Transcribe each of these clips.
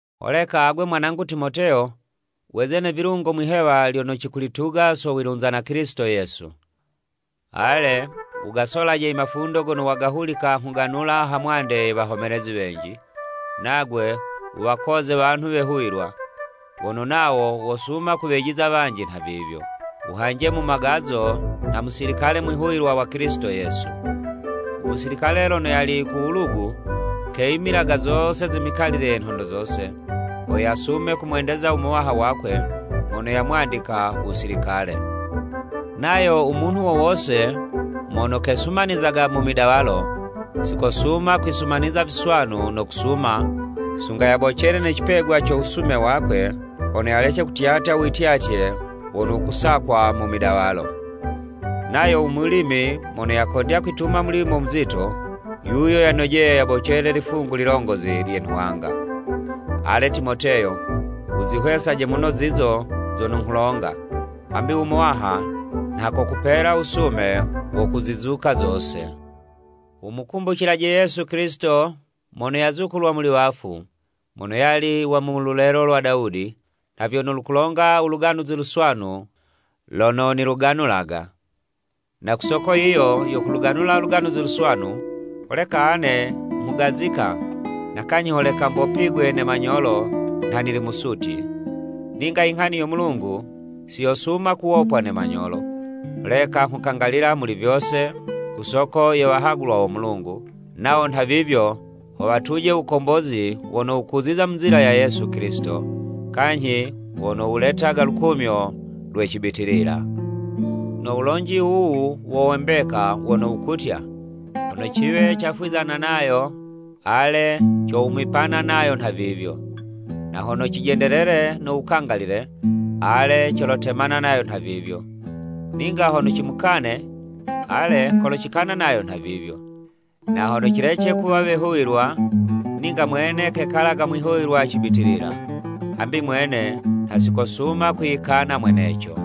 Holeka agwe mwanangu Timoteyo, weze ne vilungo mwihewa lyono cikulituga so wilunza na Kilisito Yesu. Ale, wugasolaje i mafundo gono wagahulika nghuganula ha mwande ye wahomelezi wenji, nagwe wuwakoze wanhu wehuwilwa, wono nawo wosuma kuwejiza wanji nhavivyo. Wuhanje mu magazo nha musilikale mwihuwilwa wa Kilisito Yesu. U musilikale lono yali ku wulugu, keyimilaga zose ze mikalile ye nhondo zose, ho yasume kumwendeza u muwaha wakwe mono yamwandika wusilikale. Nayo u munhu wo wose mono kesumanizaga mu midawalo, si kosuma kwisumaniza viswanu no kusuma, sunga yabocele ne cipegwa co wusume wakwe, hono yalece kutyatya u wityatye wono wukusakwa mu midawalo. Nayo u mulimi mono yakondya kwituma mulimo muzito, yuyo yanojeye yabocele i lifungu lilongozi lye nhwanga. Ale, Timoteyo, wuzihwesaje muno zizo zono nghulonga, hambi u Muwaha nha kokupela wusume wo kuzizuka zose. Wumukumbucilaje Yesu Kilisito mono yazukulwa muli wafu, mono yali wa mululelo lwa Dawudi, nha vyono lukulonga u Luganuzi Luswanu lono niluganulaga. Na ku soko yiyo yo kuluganula Luganuzi Luswanu, holeka ane nghugazika, na kanyhi holeka mbopigwe ne manyolo nha nili musutyi. Ninga inghani yo Mulungu siyosuma kuwopwa ne manyolo, holeka nghukangalila muli vyose ku soko ye wahagulwa wo Mulungu, nawo nhavivyo ho watuje u Wukombozi wono wukuziza mu nzila ya Yesu Kilisito, kanyhi wono wuletaga lukumyo lwe cibitilila. No wulonji wuwu wo we mbeka, wono wukutya, “Hono ciwe cafwizana nayo, ale, cowumipana nayo nhavivyo. Na hono cijendelele no wukangalile, ale, colotemana nayo nhavivyo. Ninga hono cimukane, ale, kolocikana nayo nhavivyo. Na hono cilece kuwa wehuwilwa, ninga mwene kekalaga mwihuwilwa cibitilila. Hambi mwene nha sikosuma kwiyikana mweneco.”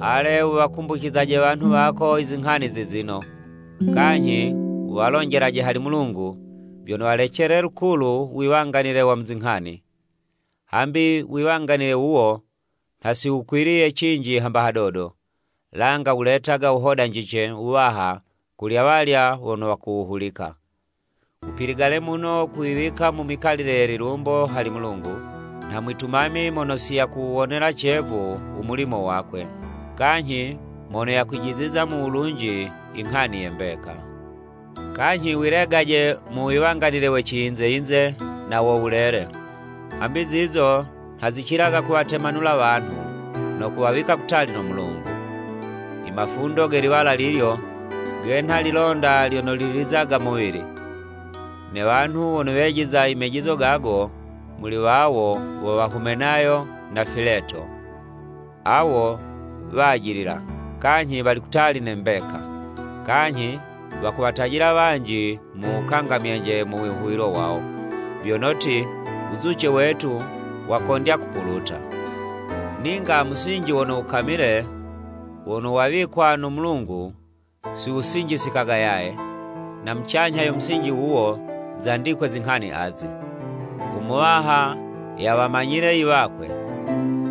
Ale, wuwakumbucizaje wanhu wako izinghani zizino, kanyhi wuwalonjelaje hali Mulungu, vyono walecele lukulu wiwanganile wa mu zinghani. Hambi wiwanganile wuwo, nha si wukwiliye cinji hamba hadodo, langa wuletaga wuhodanjice wuwaha kuli awalya wono wakuwuhulika. Wupiligale muno kwiwika mu mikalile ye lilumbo hali Mulungu nha mwitumami mono si yakuwuwonela cevu u mulimo wakwe, kanyhi mono yakwijiziza mu wulunji inghani ye mbeka. Kanyhi wilegaje mu wiwanganile we ciyinze-yinze na wo wulele, hambi zizo nha zicilaga kuwatemanula wanhu, no kuwawika kutali no Mulungu. I mafundo ge liwala lilyo, genha lilonda lyono lilizaga muwili. Ne wanhu wono wejiza imejizo gago, muli wawo wo wa Humenayo na Fileto. Awo wajilila, kanyhi wali kutali ne mbeka, kanyhi wakuwatajila wanji mu wukangamyanje mu wihuwilo wawo, vyono ti, u wuzuce wetu wakondya kupuluta. Ninga musinji wono wukamile, wono wawikwa no Mulungu si wusinjisikaga yaye, na mucanyha yo musinji wuwo, zandikwe zinghani azi, “U Muwaha yawamanyile i wakwe,”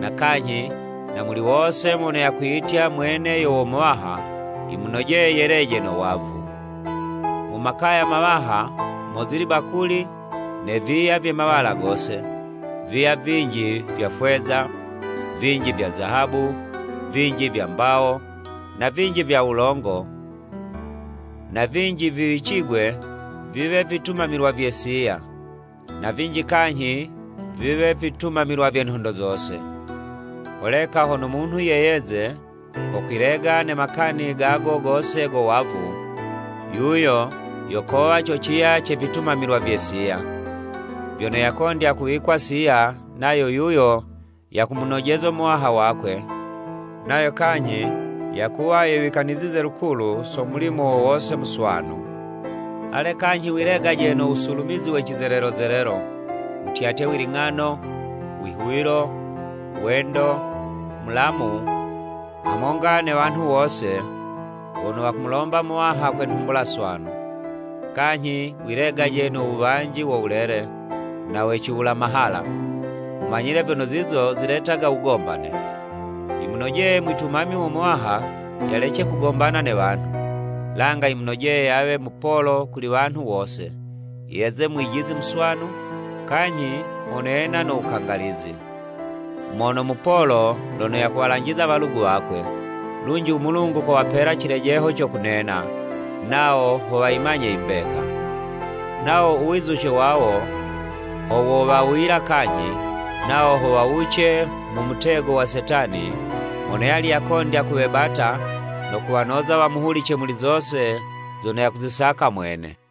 na kanyhi, “Na muli wose mono yakwiyitya, mwene yo wo Muwaha, yimunojeye yeleje no wavu.” Mu makaya mawaha, mozili bakuli ne viya vye mawala gose, viya vinji vya fweza, vinji vya zahabu, vinji vya mbawo, na vinji vya wulongo, na vinji viwicigwe viwe vitumamilwa vye siya, na vinji kanyhi viwe vitumamilwa vye nhondo zose. Holeka hono munhu yeyeze ko kwilega ne makani gago gose go wavu, yuyo yo kowa co ciya ce vitumamilwa vye siya, vyono yakondya kuwikwa siya, nayo yuyo yakumunojezo Muwaha wakwe, nayo kanyhi yakuwa yewikanizize lukulu so mulimo wo wose muswanu. Ale, kanyhi wilegaje no wusulumizi we cizelelo zelelo, wutyatye wiling'ano, wihuwilo, wendo, mulamu, hamonga ne wanhu wose wono wakumulomba Muwaha kwe nhumbula swanu. Kanyhi wilegaje no wuwanji wo wulele, na we ciwula mahala, wumanyile vyono zizo ziletaga wugombane. Yimunojeye mwitumami wo Muwaha yalece kugombana ne wanhu. Langa yimunojeye yawe mupolo kuli wanhu wose, yeze mwijizi muswanu, kanyhi mono yena no wukangalizi, mono mupolo, lono yakuwalanjiza walugu wakwe, lunji u Mulungu kowapela cilejeho co kunena, nawo ho wayimanye i mbeka. Nawo u wizuce wawo, ho wowawuyila kanyhi, nawo ho wawuce mu mutego wa Setani mono yali yakondya kuwebata no kuwanoza wamuhulice muli zose zono yakuzisaka mwene.